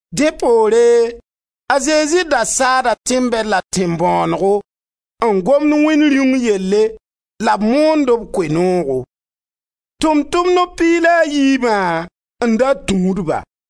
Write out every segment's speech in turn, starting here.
Dẽ poore a Zezi da saada tẽn-bɛd la tẽn-bõonego n gomd Wẽnd Rĩung yelle la b moond b Koe-noogo. Tʋʋm-tʋmdb piig la a yiibã n da tũud-ba,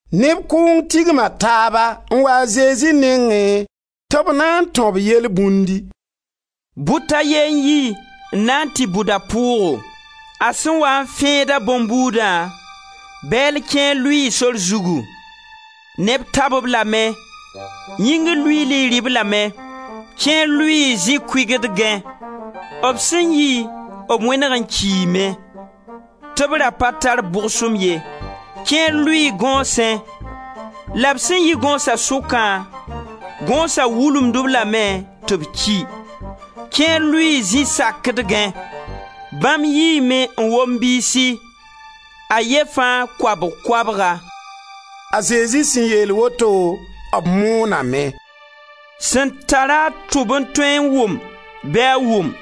Neb kʋʋng tigma taaba n waa a Zezi nengẽ tɩ b na n tão-b yelbũndi: «Bʋt a ye n yi n na n tɩ bʋd a pʋʋgo. A sẽn waa n fẽedã a bõn-buudã, bɛɛl kẽer lʋɩɩ sor zugu; neb tab-b lame, yĩngr luiili rɩ-b lame. Kẽer lʋɩɩ zĩ-kʋɩgdgẽ, b sẽn yi, b wẽneg n kiime, tɩ b ra pa tar bʋgsem ye. Kẽer lʋɩɩ gõosẽ la b sẽn yi gõosa sʋkã, gõosa wulumd-b lame tɩ b ki. Kẽer lʋɩɩ zi sakdgẽ, bãmb yiime n wom biisi, a ye fãa koabg koabga.» A Zezi sẽn yeel woto, b mooname: «Sẽn tar-a tʋb n tõe n wʋm bɩ a wʋm!»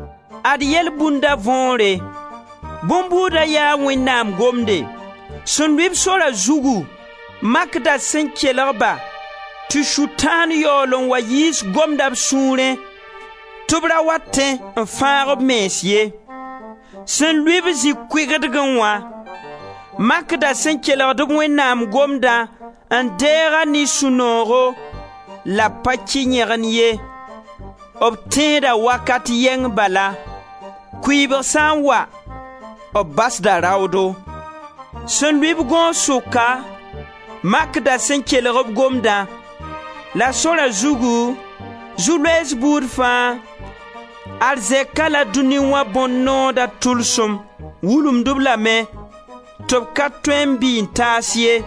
Ad yelbũnda võore: bõn-buuda yaa Wẽnnaam Gomde. Sẽn lʋɩ-b sora zugu makda sẽn kelg-ba tɩ Sʋtãan yaool n wa yiis Gomdã b sũurẽ, tɩ b ra wa tẽ n fãag b mens ye. Sẽn lʋɩ-b zĩ-kʋɩgdgẽ wã makda sẽn kelg-b Wẽnnaam Gomdã n deeg-a ne sũ-noogo la b pa kɩ yẽgen ye, b tẽeda wakat yɛng bala; kʋɩbg sã n wa, b basda raoodo. Sẽn lʋɩ-b gõos sʋka makda sẽn kelg-b Gomdã, la sora zugu, zu-loees buud fãa, arzɛka la dũni wã bõn-nooda tʋlsem wulumd-b lame tɩ b ka tõe n bɩ n taas ye.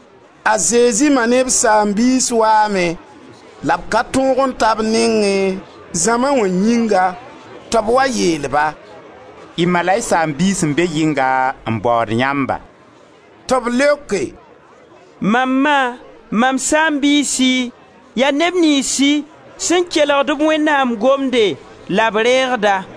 A Zezi ma ne b saam-biis waame, la b ka tõog n ta b nengẽ, zãma wã yĩnga. Tɩ b wa yeel-ba: «Y ma la y saam-biis n be yɩnga n baood yãmba.» Tɩ b leoke: «Mam ma, mam saam-biisi, yaa neb niynsi sẽn kelgd-b Wẽnnaam Gomde la b reegd-a.»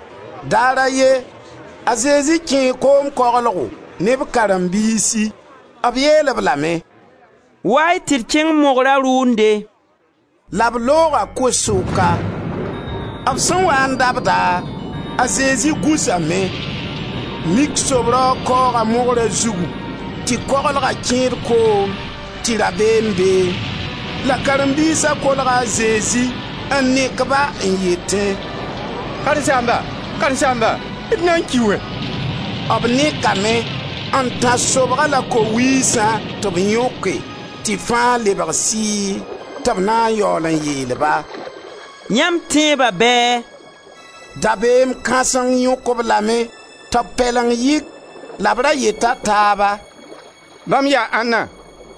Daar a ye a Zezi kẽe koom koglgo ne b karen-biisi. B yeel-b lame: «Wa-y tɩ d kẽng mogra rʋʋnde.» La b looga ko-sʋka. B sẽn waa n dabda, a Zezi gũsame. Mik sob-raoog kaooga mogra zugu, tɩ koglga kẽed koom, tɩ rabeem beẽ. La karen-biisa kolga a Zezi n nek-ba n yetẽ: «Karen-saamba, Karen-saamba, d na n ki wɛ!» B nekame, n tãs sobga la ko-wiisã tɩ b yõke, tɩ fãa lebg sɩɩ. Tɩ b na n yaool n yeel-ba: «Yãmb tẽeba bɛɛ?» Dabeem kãseng yõk-b lame tɩ b pɛleng yɩk; la b ra yeta taaba: «Bãmb yaa ãnna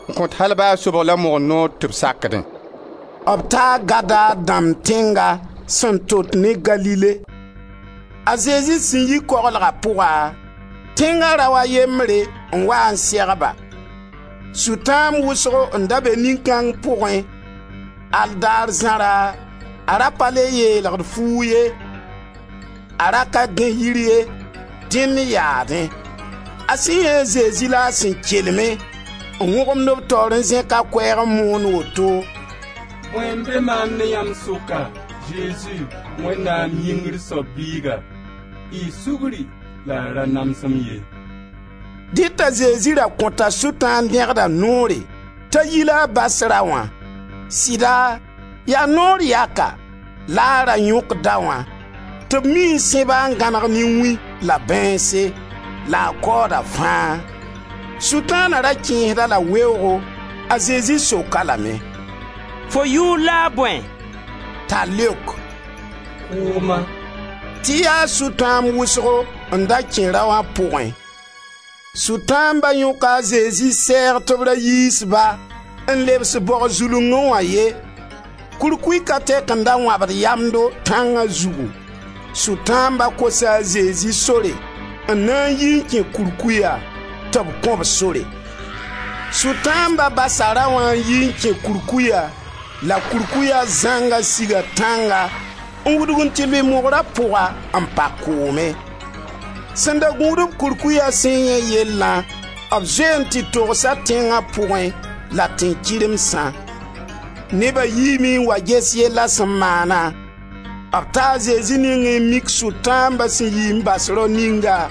n kõt al ba sobg la mogr noor tɩ b sakdẽ?» B taa Gadar dãmb tẽnga sẽn tot ne Galile. A Zezi sẽn yi koglga pʋga, tẽnga rao a yembre n wa n seg-ba. Sʋtãamb wʋsgo n da be nin-kãng pʋgẽ. Al daar zãra a ra pa le yeelgd fuug ye, a ra ka gãe yir ye, dẽnd yaadẽ. A sẽn yãe a Zezi la a sẽn kelme, n wõgemd b taoore n zẽk a koɛɛg n moon woto: «Bõe n be maam ne yãmb sʋka, Zezi, Wẽnnaam Yĩngr soab Biiga? Y sugri la y ra nams-m ye!» Dẽ t'a Zezi ra kõta Sʋtãan dẽgda noore t'a yi la a bas raoã. Sɩda, yaa naoor yaka la a ra yõk daoã, tɩ b mii n sẽb-a n gãneg ne wĩ la bãeense, la a kaooda fãa. Sʋtaana ra kẽesd-a la weoogo. A Zezi sok-a lame: «Fo yʋʋr la a bõe?» T'a leok: «Kʋʋma» tɩ yaa Sʋtãamb wʋsgo n da kẽ raoã pʋgẽ. Sʋtãamba yõka a Zezi sɛɛg tɩ b ra yiis ba n lebs-b bog zulungẽ wã ye. Kurkuy ka tɛk n da wãbd yamdo tãnga zugu; Sʋtãamba kosa a Zezi sore n na n yi n kẽ kurkuya; tɩ b kõ-b sore. Sʋtãamba basa raoã n yi n kẽ kurkuya la kurkuya zãnga siga tãnga n wudg n tɩ lʋɩ mogra pʋga, n pa koomẽ. Sẽn da gũud-b kurkuya sẽn yãe yellã, b zoe n tɩ togsa tẽnga pʋgẽ la tẽn-kɩremsã. Neba yiime n wa ges yella sẽn maana. B taa a Zezi nengẽ n mik Sʋtãamba sẽn yi n bas rao ninga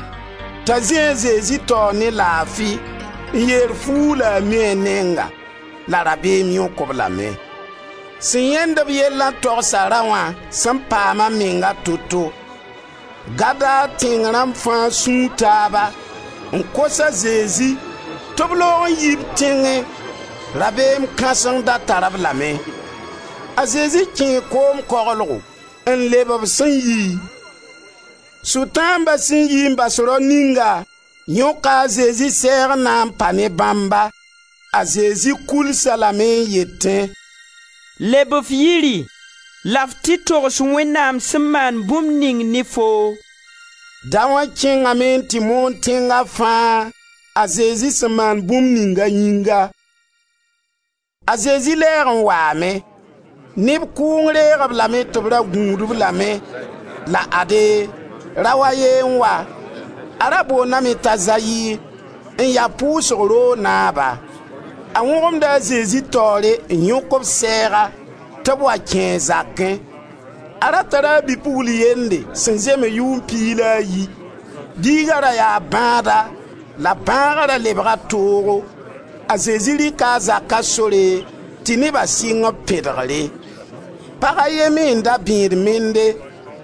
t'a zĩ a Zezi taoor ne laafi n yeer fuug la a mi a nenga. La rabeem yõk-b lame. Sẽn yãend-b yellã togsa raoã sẽn paam a menga toto. Gadar tẽng rãmb fãa sũu taaba n kos a Zezi tɩ b loog n yi b tẽngẽ. Rabeem kãseng da tar-b lame. A Zezi kẽe koom koglgo n lebe b sẽn yiẽ. Sʋtãamba sẽn yi n bas rao ninga yõka a Zezi sɛɛg n na n pa ne bãmba; a Zezi kʋls-a lame n yete: «Leb f yiri la f tɩ togs Wẽnnaam sẽn maan bũmb ning ne foo.» Daoã kẽngame n tɩ moon tẽnga fãa a Zezi sẽn maan bũmb ning a yĩnga. A Zezi lɛɛg n waame. Neb kʋʋng reeg-b lame tɩ b ra gũud-b lame la ade, rao a ye n wa. A ra boondame t'a Zayir, n ya pʋʋsg roog naaba. A wõgemda a Zezi taoore n yõk b sɛɛga tɩ b wa kẽe a zakẽ. A ra tara a bi-pugl yende sẽn zems yʋʋm piig la a yi. Biiga ra yaa bãada la bãaga ra lebga toogo. A Zezi rɩka a zaka sore, tɩ neba sɩng b pẽdgre. Pag a ye me n da bẽed mende,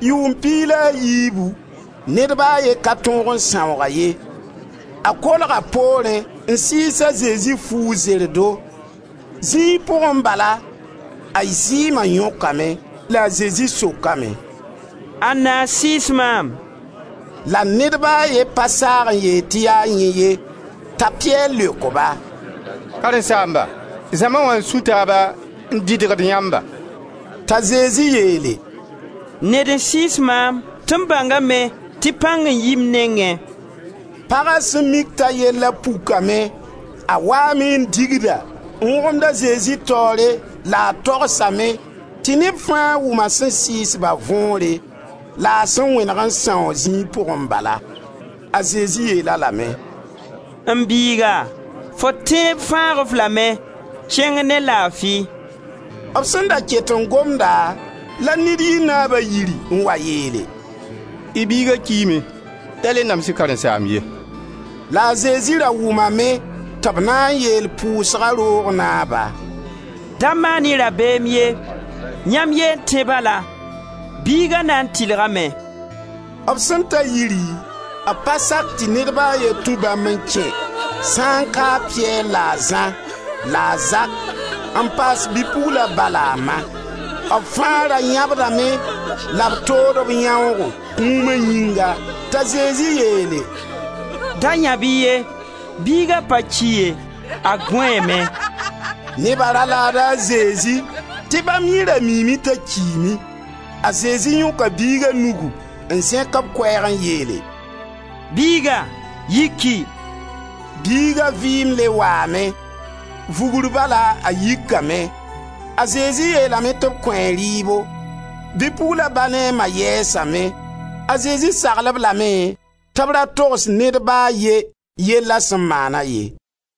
yʋʋm piig la a yiibu; ned ba a ye ka tõog n sãoog-a ye. A kolga poorẽ n sɩɩs a Zezi fuug zerdo. Zĩig pʋgẽ bala a zɩɩma yõkame. La a Zezi sokame: «Anna n sɩɩs maam?» La ned ba a ye pa saag n yeel tɩ yaa yẽ ye. T'a Piyɛr leok-ba: «Karen-saamba, zãma wã n sũ taaba n dɩdgd yãmba.» T'a Zezi yeele: «Ned n sɩɩs maam, tɩ m bãngame tɩ pãng n yi m nengẽ.» Paga sẽn mik t'a yella pukame, a waame n digda, n wõgemd a Zezi taoore la a togsame tɩ neb fãa wʋm a sẽn sɩɩs-ba võore, la a sẽn wẽneg n sãoog zĩig pʋgẽ balã. A Zezi yeel-a lame: «M biiga, fo tẽeb fãag-f lame, kẽng ne laafi.» B sẽn da ket n gomda la ned yi naaba yiri n wa yeele: «Y biiga kiime, da le nams-y karen-saamb ye.» La a Zezi ra wʋmame tɩ b na n yeel pʋʋsga roog naaba: «Da maan-y rabeem ye, yãmb ye n tẽ bala, biiga na n tɩlgame.» B sẽn ta yiri, b pa sak tɩ ned ba a ye tũ bãmb n kẽ sã n kaa a Piyɛr la a Zã, la a Zak, n paas bi-pugla ba la a ma. B fãa ra yãbdame la b tood b yãoogo, kũuma yĩnga. T'a Zezi yeele: «Da yãb-y ye, biiga pa ki ye, a gõeeme.» Neba ra laada a Zezi tɩ bãmb yẽ ra miime t'a kiime. A Zezi yõka biiga nugu, n zẽk b koɛɛg n yeele: «Biiga yiki!» Biiga vɩɩm le waame; vugr bala a yikame. A Zezi yeelame tɩ b kõ-a rɩɩbo. Bi-pugla ba ne a ma yɛɛsame; a Zezi sagl-b lame tɩ b ra togs ned ba a ye yella sẽn maana ye.